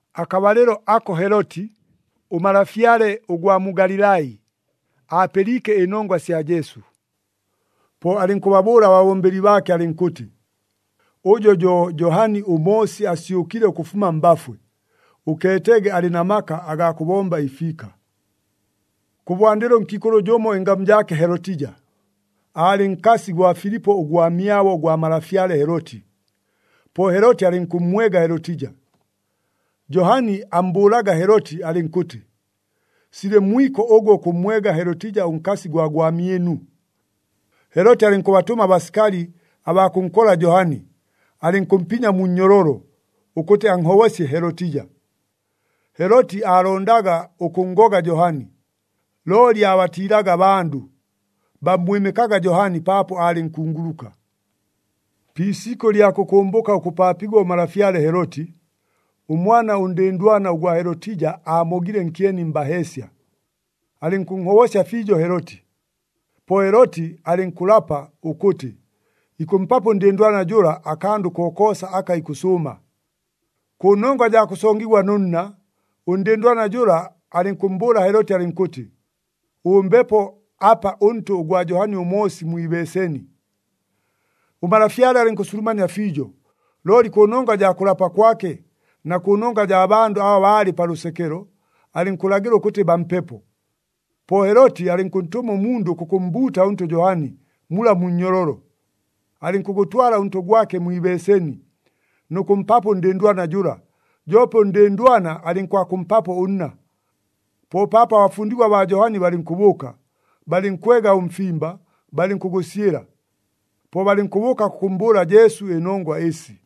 Akabalɨlo ako Heloti, ʉmalafyale ʉgwa mu Galilai, aapɨliike ɨnongwa sya Jesu. Po alɨnkʉbabʉʉla ababombeli baake alɨnkʉtɨ, “Ʉjo jo Johani ʉMoosi asyʉkile ʉkʉfuma mbafwe. Ʉkeetege alɨ na maka agaa kʉbomba ɨfiika.” Kʉbwandɨlo ʉnkiikʉlʉ jʉmo ɨngamu jaake Helotija, aalɨ nkasi gwa Filipo ʉgwamyabo gwa malafyale Heloti. Po Heloti alɨnkʉmmwega Helotija. Johani ammbʉʉlaga Heloti alɨnkʉtɨ, “Silɨ mwiko ʉgwe ʉkʉmmwega Helotija ʉnkasi gwa gwamyɨnu.” Heloti alɨnkʉbatʉma abasikali abaa kʉnkola Johani, alɨnkʉmpinya mu nnyololo, ʉkʉtɨ anhobosye Helotija. Heloti aalondaga ʉkʉnngoga Johani, looli aabatiilaga abandʉ, bammwɨmɨkaga Johani, paapo aalɨ nkunguluka. Pi isikʉ ɨlya kʉkʉmbʉka ʉkʉpaapigwa ʉmalafyale Heloti, ʉmwana ʉndɨndwana ʉgwa Helotija aamogile nkyeni mbaheesya. Alɨnkʉnhobosya fiijo Heloti. Po Heloti alɨnkʉlapa ʉkʉtɨ, ikʉmpapo ʉndɨndwana jʉla akandʉ kokoosa aka ikʉsʉʉma. Kʉnongwa jaa kʉsongigwa nʉ nna, ʉndɨndwana jʉla alɨnkʉmmbʉʉla Heloti alɨnkʉtɨ, “Ʉmbepo apa ʉntʉ ʉgwa Johani ʉMoosi mwi ibeeseni.” Ʉmalafyale alɨnkʉsulumania fiijo, looli kʉnongwa jaa kʉlapa kwake, na kʉnongwa jaa bandʉ aba baalɨ pa lʉsekelo, alɨnkʉlagɨla ʉkʉtɨ bampepo. Po Heloti alɨnkʉntʉma ʉmundʉ kʉkʉmmbuuta ʉntʉ Johani, mula mu nnyololo. Alɨnkʉgʉtwala ʉntʉ gwake mwi ibeeseni, nʉ kʉmpapo ʉndɨndwana jʉla, joope ʉndɨndwana alɨnkwakʉmpapo ʉnna. Po paapo abafundigwa baa Johani balɨnkʉbʉʉka, balɨnkwega ʉmfimba, balɨnkʉgʉsyɨla. Po balɨnkʉbʉʉka kʉkʉmmbʉʉla Jesu ɨnongwa ɨsi.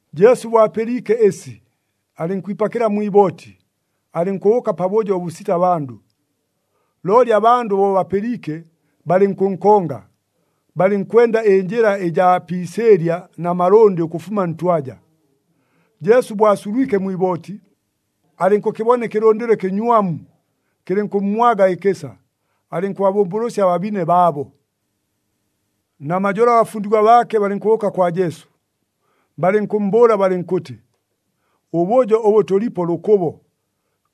Jesu bo apɨliike ɨsi, alɨnkwipakɨla mwi ibooti, alɨnkʉbʉʉka pabʉjo ʉbʉsita bandʉ. Looli abandʉ bo bapɨliike, balɨnkʉnkonga, balɨnkwenda ɨnjɨla ɨjaa pi isɨɨlya na malʉndɨ ʉkʉfuma ntwaja. Jesu bo asulwike mwi ibooti, alɨnkʉkɨbona ɨkɨlʉndɨlo ɨkɨnywamu, kɨlɨnkʉmmwaga ɨkɨsa, alɨnkʉbabʉmbʉlʉsya ababine baabo. Namajolo abafundigwa baake balɨnkʉbʉʉka kwa Jesu, balɨnkʉmmbʉʉla balɨnkʉtɨ, “Ʉbʉjo ʉbʉ tʉlipo lʉkʉbo,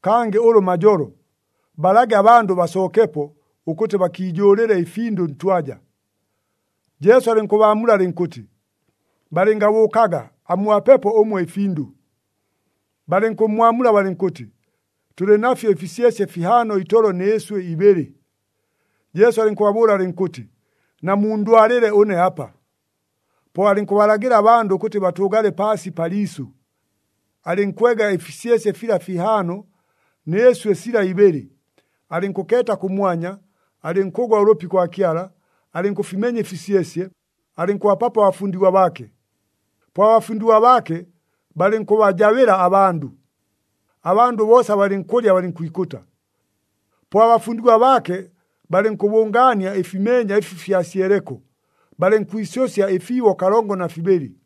kangɨ ʉlʉ majolo. Balage abandʉ basookepo, ʉkʉtɨ bakiijʉʉlɨle ɨfindʉ ntwaja.” Jesu alɨnkʉbaamula alɨnkʉtɨ, “Balɨngabʉʉkaga, amubapepo ʉmwe ɨfindʉ.” Balɨnkʉmmwamula balɨnkʉtɨ, “Tʉlɨ nafyo ɨfisyesye fihaano itolo nɨ ɨswɨ ibɨlɨ.” Jesu alɨnkʉbabʉʉla alɨnkʉtɨ, “Namundwalɨle ʉne apa.” Po alɨnkʉbalagɨla abandʉ ʉkʉtɨ batʉʉgale paasi pa liisʉ. Alɨnkwega ɨfisyesye fila fihaano, nɨ ɨswɨ sila ibɨlɨ, alɨnkʉkeeta kʉmwanya, alɨnkʉgwa ʉlʉpi kwa Kyala, alɨnkʉfimenya ɨfisyesye, alɨnkʉbapapo abafundigwa baake. Po abafundigwa baake balɨnkʉbajabɨla abandʉ. Abandʉ boosa balɨnkʉlya, balɨnkwikʉta. Po abafundigwa baake balɨnkʉbʉngaania ɨfimeenya ɨfi fyasyeleko, balɨnkwisʉsya ɨfiibo kalongo na fibɨlɨ.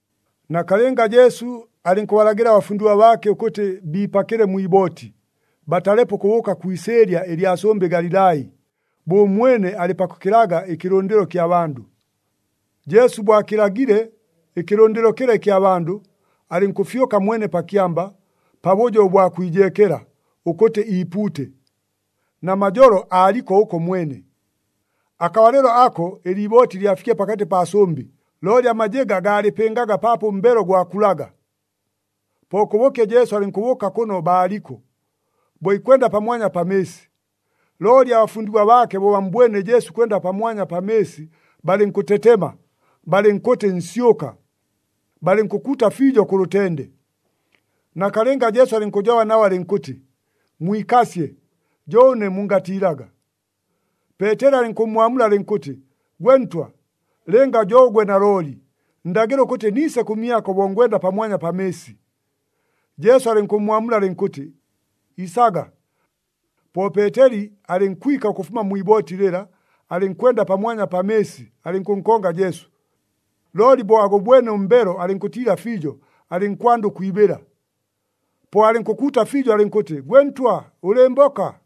Nakalɨnga Jesu alɨnkʉbalagɨla abafundigwa baake ʉkʉtɨ biipakɨle mwi ibooti, batalepo ʉkʉbʉʉka kwi isɨɨlya ɨlya sʉmbɨ Galilai, bo ʉmwene alɨ pakʉkɨlaga ɨkɨlʉndɨlo kya bandʉ. Jesu bo akɨlagile ɨkɨlʉndɨlo kɨla ɨkya bandʉ, alɨnkʉfyʉka mwene pa kyamba, pabʉjo ʉbwa kwijeekela, ʉkʉtɨ iipuute. Namajolo aaliko ʉko mwene. Akabalɨlo ako ɨliibooti lyafikile pakatɨ paa sʉmbɨ, looli amajɨga gaalɨpɨngaga paapo ʉmbelo gwakulaga. Po kʉbʉkye Jesu alɨnkʉbʉʉka kʉno baaliko, bo ikwenda pamwanya pa mɨɨsi. Looli abafundigwa baake bo bammbwene Jesu ikwenda pamwanya pa mɨɨsi, balɨnkʉtetema, balɨnkʉtɨ, “Nsyʉka!” Balɨnkʉkuuta fiijo kʉ lʉtende. Nakalɨnga Jesu alɨnkʉjoba nabo, alɨnkʉtɨ, “Mwikasye, jo ʉne! Mungatiilaga!” Peeteli alɨnkʉmmwamula alɨnkʉtɨ, “Gwe Ntwa, lɨnga jo ʉgwe nalooli, ndagɨla ʉkʉtɨ niise kʉmyako bo ngwenda pamwanya pa mɨɨsi.” Jesu alɨnkʉmmwamula alɨnkʉtɨ, “Isaga.” Po Peeteli alɨnkwika ʉkʉfuma mwi ibooti lɨla, alɨnkwenda pamwanya pa mɨɨsi, alɨnkʉkonga Jesu. Looli bo agʉbwene ʉmbelo alɨnkʉtiila fiijo, alɨnkwanda ʉkwibɨla. Po alɨnkʉkuuta fiijo alɨnkʉtɨ, “Gwe Ntwa, ʉlɨɨmboka!”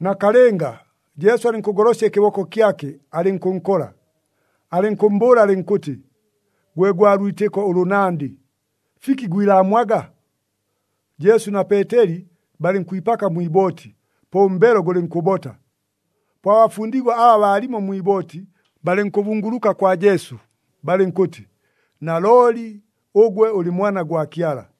Nakalɨnga, Jesu alɨnkʉgolosya ɨkɨboko kyake, alɨnkʉnkola, alɨnkʉmmbʉʉla alɨnkʉtɨ, “Gwe gwa lwitɨko ʉlʉnandɨ, fiki gwilaamwaga?” Jesu na Peeteli balɨnkwipaka mwi ibooti, po ʉmbelo gʉlɨnkʉbota. Po abafundigwa aba baalimo mwi ibooti, balɨnkʉbunguluka kwa Jesu, balɨnkʉtɨ, “Nalooli ʉgwe ʉlɨ Mwana gwa Kyala!”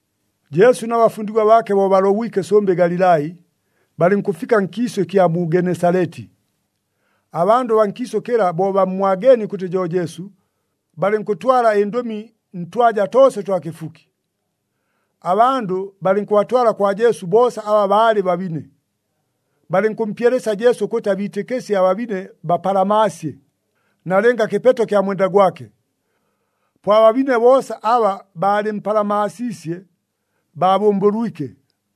Jesu na bafundigwa baake bo balobwike sʉmbɨ Galilai, balɨnkʉfika nkiisʉ ɨkya mu Genesaleti. Abandʉ baa nkiisʉ kɨla bo bammwageenie ʉkʉtɨ jo Jesu, balɨnkʉtwala ɨndʉmi ntwaja toosa ʉtwa kɨfuki. Abandʉ balɨnkʉbatwala kwa Jesu boosa aba baalɨ babine. Balɨnkʉmpyelesya Jesu ʉkʉtɨ abiitɨkɨsye ababine bapalamaasye, nalɨnga kɨpeto kya mwenda gwake. Po ababine boosa aba baalɨmpalamaasiisye, baabʉmbʉlwike.